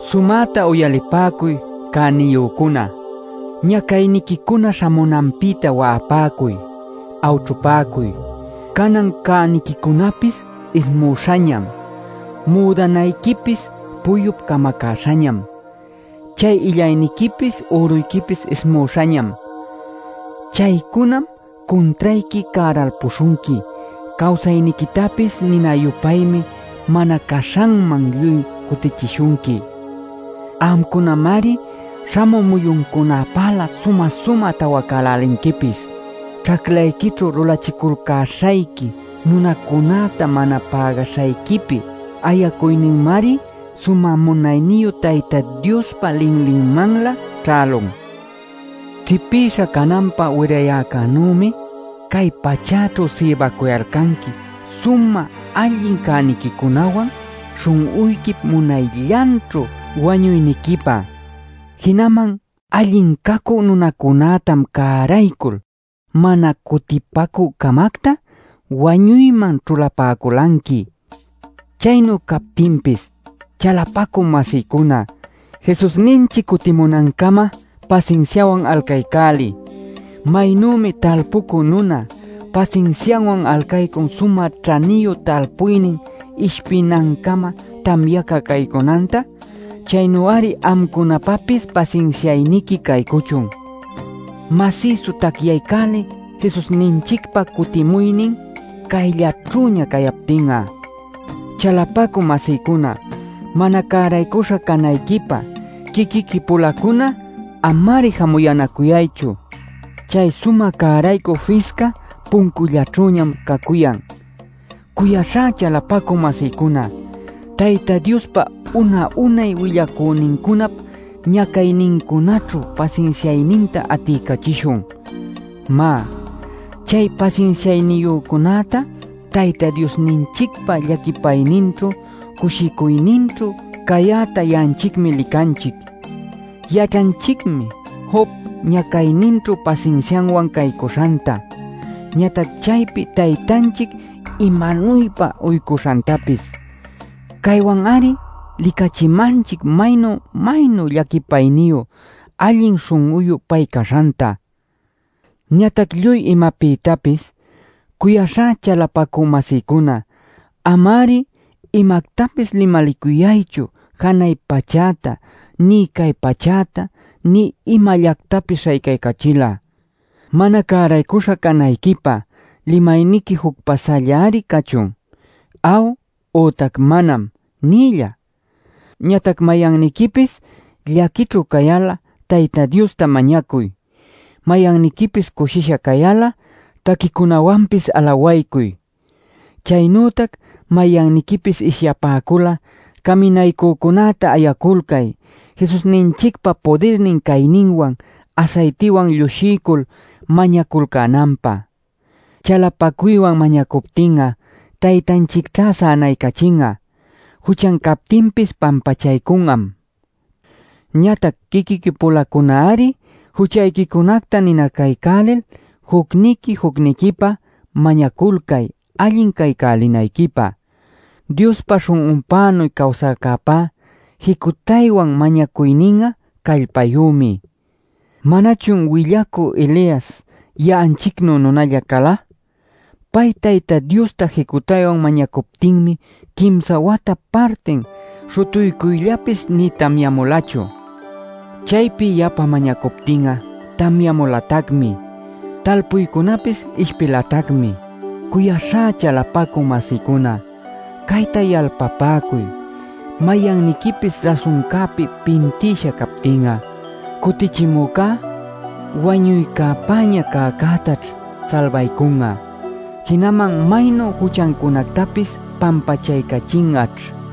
Sumäta uyalipäcuy cäniyücuna: ñacayniquicuna śhamunanpïta wa'apäcuy, awćhupäcuy. Canan cäniquicunapis ismüśhañam. Müdanayquipis puyup camacäśhañam. Chay illayniquipis, üruyquipis ismüśhañam. Chaycunam cuntrayqui cäralpuśhunqui; cawsayniquitapis nina-yupaymi mana caśhanman lluy cutichishunqui. Amcunamari śhamü muyuncunäpälä sumä-sumä tawacälälinquipis. ¡Ćhaclayquićhu lulachiculcäśhayqui nunacunäta mana pägaśhayquipi ayacuyninmari sumä munayniyu Tayta Diospa linlinmanlä ćhälun! Ćhipïsha cananpä wirayäcänümi cay pachäćhu sïbacuyalcanqui sumä alli cäniquicunawan śhun'uyquip munayllanćhu wañuyniquipä. Jinaman allin cacü nunacunätam cäraycul, mana cutipacü-camacta wañuyman ćhulapäculanqui. Chaynu cayaptinpis, chalapacü-masïcuna, Jesusninchic cutimunancama pasinsiawan alcaycäliy. Maynümi talpucü nuna pasinsiawan alcaycun sumä ćhaniyu talpuynin ishpinancama tamyaca caycunanta, chaynu-ari amcunapapis pasinsiayniqui caycuchun. Masïsu tacyaycäliy Jesusninchicpa cutimuynin cayllaćhüña cayaptin'a. Chalapacü-masïcuna, mana cäraycuśha canayquipá quiquiqui-pulacuna ama-ari jamuyänacuyaychu. Chay Sumä Cäraycü Fisca puncullaćhüñam cacuyan. Cuyaśhá chalapacü-masïcuna, Tayta Diospa una-unay willacünincunap ñacaynincunaćhu pasinsiayninta atiycachishun. Má, chay pasinsiayniyücunäta Tayta Diosninchicpa llaquipayninćhu cushicuyninćhu cayäta ya'anchicmi licanchic. Yaćhanchicmi Job ñacayninćhu pasinsiawan caycuśhanta, ñatac chaypi Taytanchic imanuypa uycuśhantapis. Caywanmari licachimanchic maynu maynu llaquipayniyu, allin śhun'uyu pay caśhanta. Ñatac lluy imapïtapis, cuyaśhá chalapacü-masïcuna, ama-ari imactapis limalicuyaychu janay pachäta, nï cay pachäta, nï imallactapis śhaycaycachil'a. Mana cäraycuśha canayquipá limayniqui juc pasällari cachun “aw” ütac “manam” nïlla. Ñatac mayanniquipis llaquićhu cayal'a Tayta Diosta mañacuy. Mayanniquipis cushisha cayal'a taquicunawanpis alawaycuy. Chaynütac mayanniquipis ishyapäcul'a caminaycücunäta ayaculcay Jesusninchicpa pudirnin cayninwan asaytiwan llushiycul mañaculcänanpä. Chalapacuywan mañacuptin'a Taytanchicćha sänaycachin'a. Juchan captinpis pampachaycun'am. Ñatac quiquiqui-pulacunari juchayquicunacta ninacaycälil jucniqui jucniquipä mañaculcay allin caycälinayquipä. Diospa śhun'unpänuy cawsäcäpa jicutaywan mañacuynin'a callpayümi. ¿Manachun willacü Elias ya'anchicnu nunalla cala? Pay Tayta Diosta jicutaywan mañacuptinmi quimsa wata partin śhutuycuyllapis nï tamyamulachu. Chaypi yapa mañacuptin'a tamyamulatacmi, talpuycunapis ishpilatacmi. Cuyaśhá chalapacü-masïcuna, cayta yalpapäcuy: mayanniquipis rasuncäpi pintïsha cayaptin, cutichimücá wañuycäpäña cäcätaćh salbaycun'a. Jinaman maynu juchancunactapis pampachaycachin'aćh.